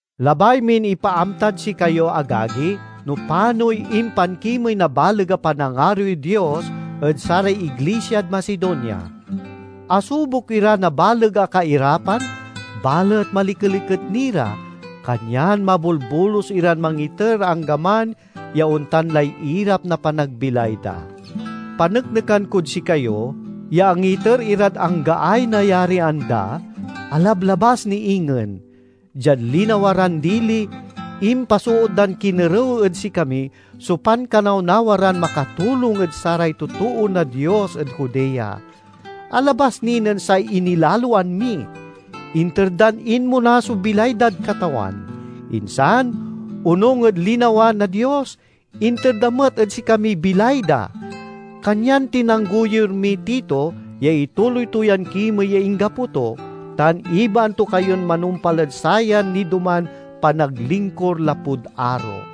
Labay min ipaamtad sikayo, agagi, no panoy impankimey na baleg a panangaroy Dios ed saray iglisiad Macedonia. Asubok ira na baleg a kairapan, balet malikeliket ni ra, kanyan mabolbolus iran mangiter anggaman ya ontan lay irap na panagbilay da. Paneknekan kod sikayo ya angiter irad anggaay nayarian da, alablabas ni ingen. Diad linawa ran dili, impasoot dan kinerew ed sikami so pankanawnawa ran makatulong ed saray totoo na Dios ed Judea. Alabas ni nen say inilaloan mi! Inter dan inmona so bilay dad Katawan; insan, onung ed linawa na Dios, inter da met ed sikamiy bilay da. Kanyan tinanggoyur miy Tito ya ituloy to yan kimey ya inggapo to, tan ibaan to kayon manumpal ed sayan nidoman panaglingkur lapud aro.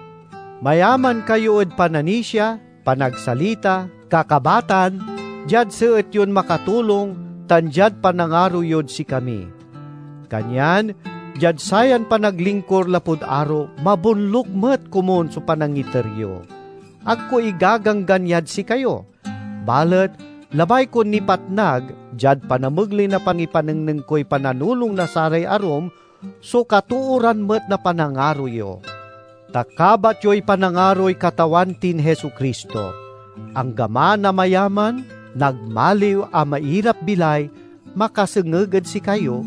Mayaman kayo ed pananisia, panagsalita, kakabatan, diad seet yon makatulong, tan diad panangaro yod sikami. Kanyan diad sayan panaglingkur lapud aro, mabonluk met komun so panangiter yo. Ag ko igaganggan yad sikayo; balet labay kon nipatnag, diad panamegley na pangipanengneng koy pananulong na saray arum, so katooran met na panangaro yo. Ta kabat yoy panangaroy Katawan tin Jesu-Cristo; anggaman a mayaman nagmaliw a mairap-bilay makasengeg ed sikayo,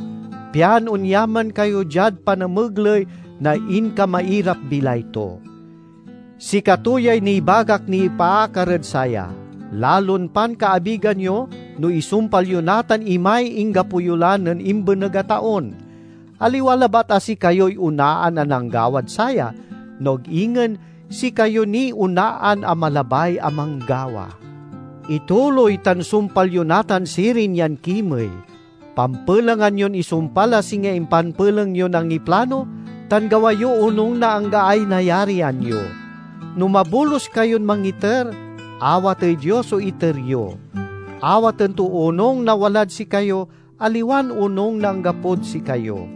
pian onyaman kayo diad panamegley na inkamairap-bilay to. Sikato yay nibagak nipaakar ed saya: lalon pankaabigan yo no isumpal yo natan imay inggapo yo la nen imbeneg a taon. Aliwa labat a sikayoy onaan a nanggawad saya, no ag ingen sikayo niy onaan a malabay a manggawa. Ituloy tan sumpal yo natan sirin yan kimey. Pampelengan yon isumpal a singa impanpeleng yon angiplano, tan gawa yo onung na anggaay nayarian yo. No mabolus kayon mangiter, awatey Dios so iter yo. Awaten to onung na walad sikayo, aliwan onung na anggapod sikayo.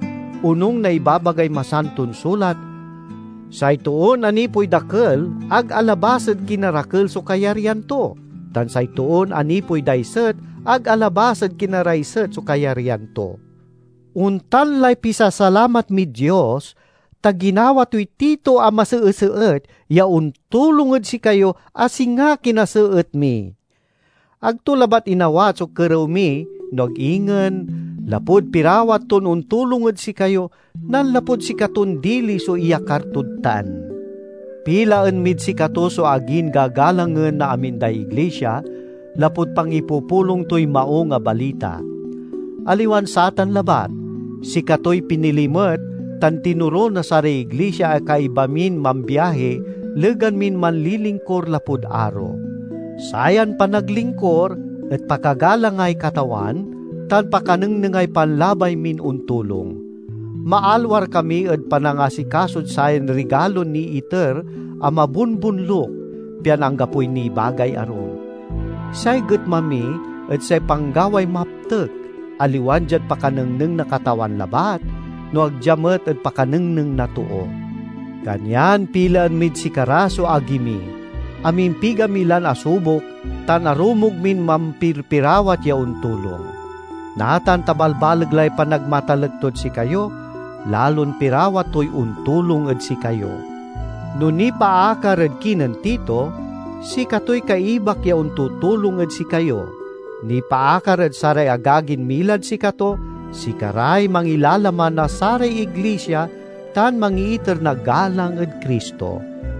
Onung na ibabagay Masanton Sulat, "Say toon anipoy dakel ag alabas ed kinarakel so kayaryan to, tan say toon anipoy daiset ag alabas ed kinaraiset so kayaryan to." Ontan lay pisasalamat mid Dios, ta ginawa toy Tito a maseeseet ya ontulong ed sikayo a singa kinaseet mi! Ag to labat inawat so kerew mi no ag ingen, lapud pirawat ton ontulong ed sikayo, nanlapud sikaton dili so iyakar tod tan. Pilaen mid sikato so agin gagalangen na amin day iglisia, lapud pangipupulong toy Maung a Balita. Aliwan satan labat, sikatoy pinili met tan tinoro na saray iglisia a kaiba min mambiahi legan min manlilingkur lapud aro. Sayan panaglingkur et pakagalangay Katawan, tan pakanengnengay panlabay min ontulong. Maalwar kami ed panangasikasod sayan rigalon niiter a mabonbonluk, pian anggapoy nibagay arum. Say getma mi et say panggaway maptek, aliwan diad pakanengneng na Katawan labat, no ag dia met ed pakanengneng na too. Kanyan pilaen mid sikara so agi mi; amimpiga mi lan asubok tan arumog min mampirpirawat ya ontulong. Natan ta balbaleg lay panagmatalek tod sikayo, lalon pirawat toy ontulong ed sikayo. No nipaakar ed kinen Tito, sikatoy kaibak ya ontutulong ed sikayo; nipaakar ed saray agagin milad sikato, sikaray mangilalaman na saray iglisia tan mangiiter na galang ed Cristo.